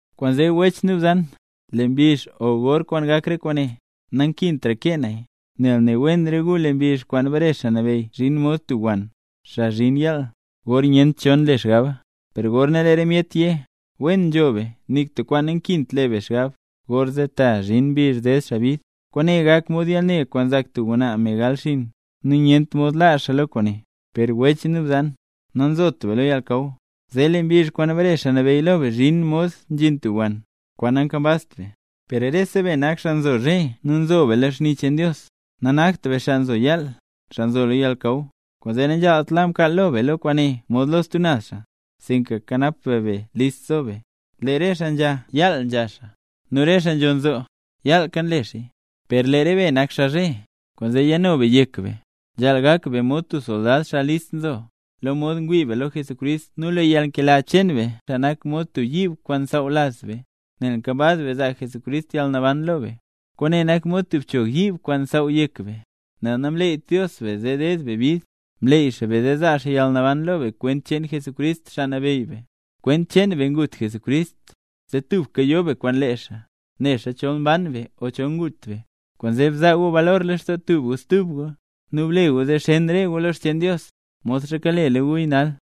Kwaanzee wech nu bzan, lee mbizh o gor kwaan gak re kwaane, nankintra kee naya, nel ne wen re gu, lee mbizh kwaan bare Xaa Nabeyy zhin mod tub wann, xaa nzhin yaal, gor nyent cho nle xgaba. Gorna lee re myet yé: “Wen nzho be nik tub kwaan nankint le be xgab”, gorzee ta zhin mbizh ded xaa bid. Kwaane gak mod yalne kwaan nzak tub ngwnaa, me gal xiin, nu nyent mod laa xaa lo kwaane. Per wech nu bzan, nanzot be lo yalnakaw, zee lee mbizh kwaan bare Xaa Nabeyy zhin lo be mod nzhin tub wann, kwaan nankambazt be. Per rese be nak xaa nzo zhe nu nzo be lo xni cheen Dios, nanakt be xaa nzo yaal, xaa nzo lo yalnakaw. Kwaanzee nanzhaalt la mkaal lo be lo kwaane mod lo stub naz xaa, sinka kanap be be, list zo be. Lee re xaa nzha, yaal nzha xaa; nu re xaa nzho nzoo, yaalka nle xaaya. Per lee re be nak xaa zhe; kwaanzee yano be yek be. Nzhaal gak be mod tub soldad, xaa list nzo, lo mod ngwii be lo Jesucrist nu lee yalnkela cheen be nak mod tub yiib kwaan nsaaw laz be. Nel nkambaz be zaa Jesucrist yalnaban lo be, kwaane nak mod tub bchog yiib kwaan nsaaw yek be. Nel namleeyt Dios be zee deed be bid, mleey xaa be zee zaa xaa yalnaban lo be kwent cheen Jesucrist, Xaa Nabeyy be. Kwent cheen be ngut Jesucrist, zee tubka yo be kwaan lee xaa, nixa chol mban be o chol ngut be. Kwaanzee, bzaa gu balor lextoo tub gu stub gu, nu ble gu zee xen re gu lo xcheen Dios, modxa kalela guya nal.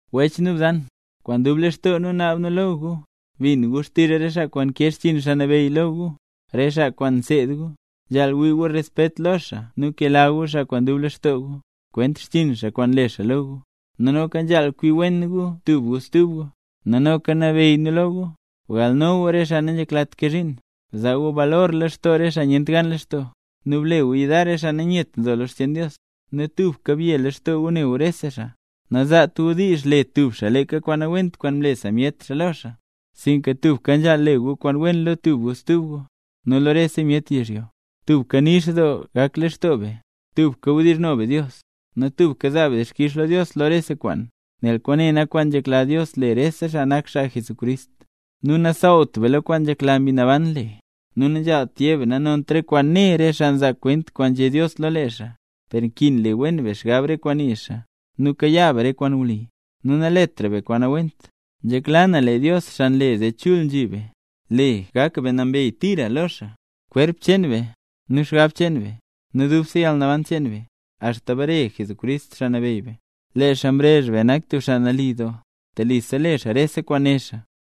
Wech nu bzan, kwaan dub lextoo nu naab nu lo gu, bin gu xtizh re xaa kwaan nkee xchiin Xaa Nabeyy lo gu, re xaa kwaan nseed gu. Nzhaal wii gu respet lo xaa nu kela gu xaa kwaan dub lextoo gu, kwent xchiin xaa kwaan nle xaa lo gu. Nu noka nzhaal kwi wen gu tub gu stub gu. Nu noka nabeyy nu lo gu, bgalno gu re xaa nanzheklat kee zhiin, bzaa gu balor lextoo re xaa nyent gan lextoo, nu ble gu yudar re xaa nanyet nzo lo xcheen Dios, nu tubka bye lextoo gu ne gu rese xaa. Nazaat gu diizh le tub xaa leeka kwaan nawent kwaan mle sa myet xaa lo xaa, sinka tubka nzhaal le gu kwaan wen lo tub gu stub gu, nu lo rese myet yizhyo. Tubka nix doo gak lextoo be. Tubka wdizhno be Dios. Nu tubka zaa be dixkix lo Dios lo rese kwaan, nel kwaane nak kwaan nzhekla Dios le rese xaa nak xaa Jesucrist. Nu nasaawt be lo kwaan nzhekla Mbi Naban le. Nu nanzhaalt yé be nanont re kwaan né re xaa nzaa kwent kwaan nzhé Dios lo lee xaa. Per nkin le wen be xgab re kwaan nii xaa, nu kayaa be re kwaan wli, nu naletra be kwaan nawent. Nzhekla na lee Dios, xaa nle zee chul nzhi be, le gak be nambey tira lo xaa, kwerp cheen be, nu xgab cheen be, nu dubse yalnaban cheen be, axta bare Jesucrist, Xaa Nabeyy be. Lee xaa mrezh be nak tub xaa nali doo, telisa le xaa rese kwaan né xaa.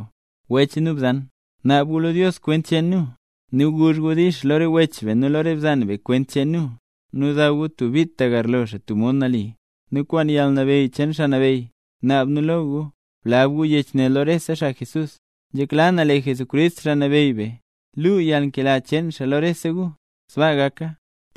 Wech nu bzan, naabka gu lo Dios kwent cheen nu. Nu guzh gu “dix” lo re wech be nu lo re bzan be kwent cheen nu, nu daw gu tub bit tagarlo xaa tub mod nali. Nu kwaan yalnabeyy cheen Xaa Nabeyy, naab nu lo gu, blab gu yech ne lo rese xaa Jesús, xaa nambey. Nzhekla na lee Jesucrist, Xaa Nabeyy be, luu yalnkela cheen xaa lo rese gu. Sbaa gaka.